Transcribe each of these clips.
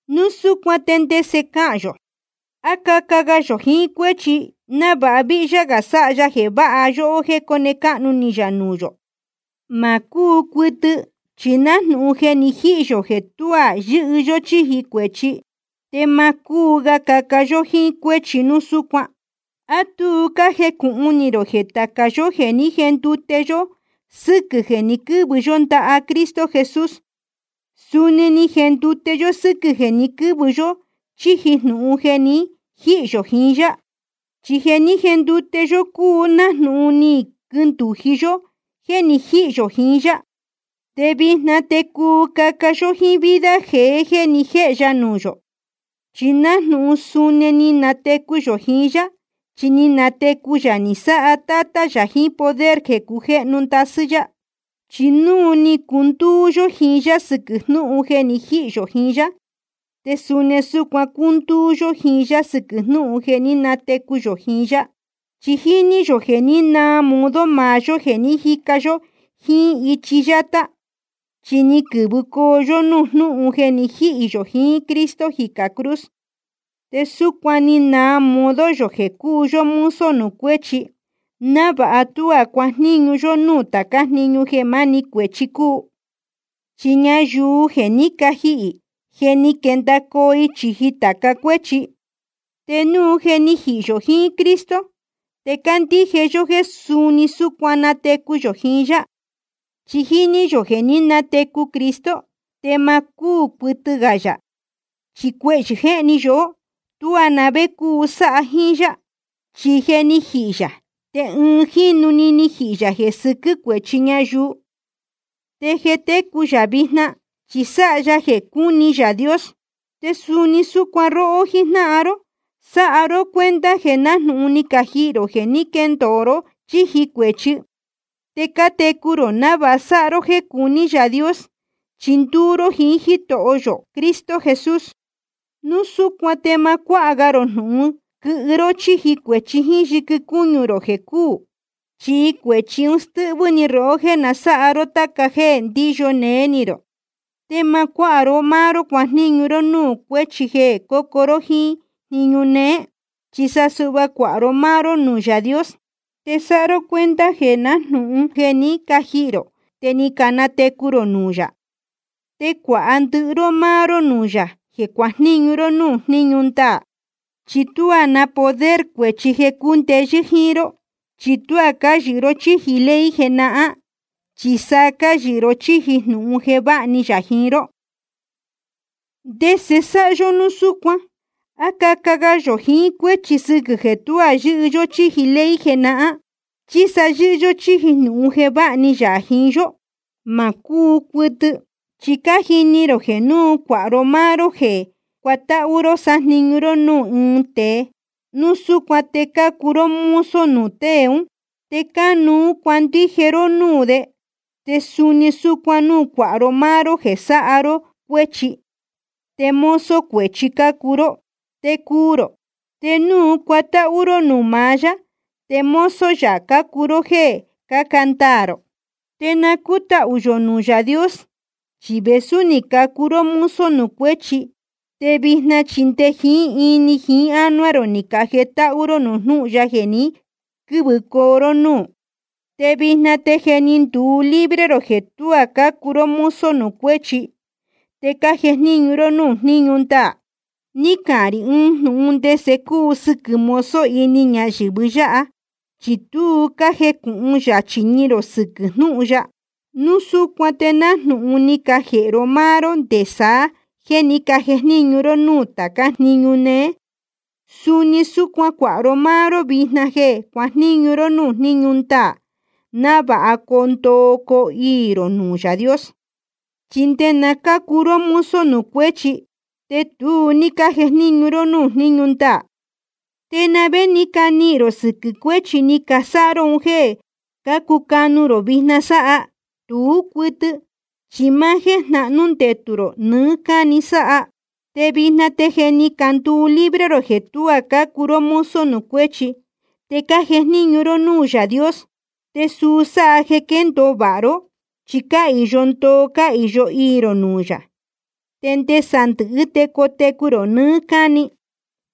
Núu súcuan ¿te ndese cahān yō? ¿A caca ga yō jiín cuéchi návāha víhyá gā sáha ya jeē váha yóhó jéē cóne cáhnu ni yā nuū yō? Ma cúu cuɨtɨ. Chi nájnūhun je ni jihī yō jeē tuá yɨ́hɨ yó chíji cuēchi, te ma cúu ga caca yó jiín cuéchi núu súcuan. ¿A tu cájecūhun ni rō jeē tāca yó jeē ní jendute yó sɨ́quɨ̄ jeē ni quɨ́vɨ yó ndaha Cristo Jesús, suni ni jendute yó sɨ́quɨ̄ jeē ni quɨ́vɨ yó chíji jnūhun jeē ni jíhī yō jiín yá? Chi jeē ní jendute yó cúu nájnūhun ni quindūji yó jéē ni jíhī yō jiín yá. Te vijna te cuu caca yó jíín vida jeé jeē ni jéhe ya nuū yō, chi nájnūhun suni ni natecu yō jiín yá. Chi ni natecu yā ni sáha Tátá yā jiín poder jeē cujéhnu ndasɨ́ yá. Chi núu ni cundúú yó jiín yá sɨquɨ̄ jnúhun jeē ni jíhī yō jiín yá, te suni súcuan cúndúú yó jiín yá sɨquɨ̄ jnúhun jeē ní natecu yō jiín yá. Chi jíní yō jeē ní naa modo maá yó jeē ni jíca yó jíín ichi yátá, chi ni quɨ̄vɨ yó núū jnúhun jeē ni jíhī yō jiín Cristo jicā cruz. Te súcuan ni naa modo yō jeē cúu yó mozo nuū cuéchi, návāha tuá cuajníñu yó núū tācá jniñu jeē máni cuēchi cúu. Chi ñayuu jeē jé ni cajihī, je ni quendacoo i chīji tāca cuéchi. Te núu je ni jihī yō jiín Cristo, te cándíje yó jéē suni súcuan ni natecu yō jiín yá. Chi jíní yō jeē ní natecu Cristo, te ma cúū cuɨtɨ ga yā, chi cuehyɨ̄ jéhni yóhó, tuá na vé cúu sáha jíín yá. Chi jeē ni jíhī yā, te ɨɨn jínu‑ni ni jihī yā jeē sɨquɨ́ cuēchi ñayuu. Te jeē técu yā vijna, chi sáha ya jeē cuní Yaā Dios. Te suni súcuan róhó jíjnáhan ró, sáha ró cuenta jeē nájnūhun ni cajihī rō jeē ní quendacoo ró chíji cuēchi. Te cátecu rō návāha sáha ró jéē cuní Yaā Dios, chi ndúú ró jiín Jítoho yō Cristo Jesús. Núu súcuan te ma cuáha ga rō jnūhun quɨhɨ ró chíji cuēchi jíín yɨquɨ cúñu rō jeē cúū. Chi cuēchi ún stɨ́hvɨ́ ni rohó jéē na sáha ró táca jéē ndíyo néé ni rō. Te ma cuáha ró máá ró cuajníñu ró núū cuéchi jeē cócuu ró jíín jniñu néé. Chi sa suhva cuāha ró máá ró nuū Yaā Dios, te sáha ró cuenta jeē nájnūhun je ni cajihī rō te ni canatecu rō nuū yā. Te cuāha ndɨhɨ ró máá ró nuū yā jeē cuajníñu ró núū jniñu ndaā. Chi tuá na poder cuēchi jeē cundeyɨ́ jíín ró, chi tuá cáyɨhɨ ró chíji ley jenahán, chi sa cáyɨhɨ ró chíji jnūhun jeē váha ni yā jiín ró. ¿Ndese sáha yó núu súcuan? ¿A caca ga yō jiín cuéchi sɨquɨ̄ jeē tuá yɨ́hɨ yó chíji ley jenahán, chi sa yɨ́hɨ yó chíji jnūhun jeē váha ni yā jiín yó? Ma cúu cuɨtɨ. Chi cájini rō jeē núu cuāha ró máá ró jeē cuatáhú ró sájniñu ró núū ɨɨn tēe, núu súcuan te cácuu ró mozo nuū tée ún, te cánuú cuandije ró núū de. Te suni súcuan núu cuāha ró máá ró jeē sáha ró cuéchi, te mozo cuēchi cácuu ró, te cuu rō. Te núu cuatáhú ró nuū maá yá, te mozo yā cácuu ró jéē cáca ndaā rō. Te na cútahū yō nuū Yaā Dios, chi vēsú ni cacuu ró mozo nuū cuéchi, te vijna chi nde jiín ini jiín ánuá rō ni cajetáhú ró nuū jnúhun ya jeē ni quɨ́vɨcoo ró núū. Te vijna te je ni nduu libre rō jeē tuá cácuu ró mozo nuū cuéchi, te cájejníñu ró núū jníñu ndaā. (Ni cahān rī ɨɨn jnūhun ndese cúu sɨquɨ̄ mozo ini ñayɨ̄vɨ yáha, chi tu cájecūhun yachī ni rō sɨquɨ̄ jnúhun ya.) Núu súcuan te nájnūhun ni cajēhe ró máá ró nde saá jeē ní cajejníñu ró núū tācá jniñu jnéhén jniñu néé, suni súcuan cuāha ró máá ró vijna jeē cuajníñu ró núū jníñu ndaā, návāha coo ndoo coo iī rō nuū Yaā Dios. Chi nde náa cácuu ró mozo nuū cuéchi, te tu ní cájejníñu ró núū jníñu ndaā. ¿Te na vé ni canihīn rō sɨquɨ̄ cuéchi ni casáha ró un jéē cácucanu rō vijna sáha? Tú cuɨtɨ, chi máá jéē jnahnú ndetū rō nɨɨ́ cáni sáha. Te vijna te je ni canduu libre rō jeē tuá cácuu ró mozo nuū cuéchi, te cájejníñu ró núū Yaā Dios. Te suu sáha jeē quéndōo vāha ró, chi cáhīyo ndoo cáhīyo iī rō nuū yā, te nde sandɨ̄hɨ́ te cotecu rō nɨɨ́ cáni.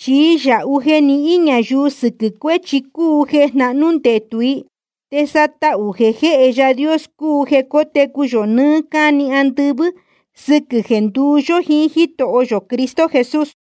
Chi yāhu jeē nihín ñayuu sɨquɨ̄ cuéchi cúu jeē jnahnú ndetū i. Te sa tahū jeē jéhe Yaā Dios cúu jeē cótecu yō nɨɨ́ cáni andɨvɨ́, sɨquɨ̄ jeē nduú yó jíín Jítoho yō Cristo Jesús.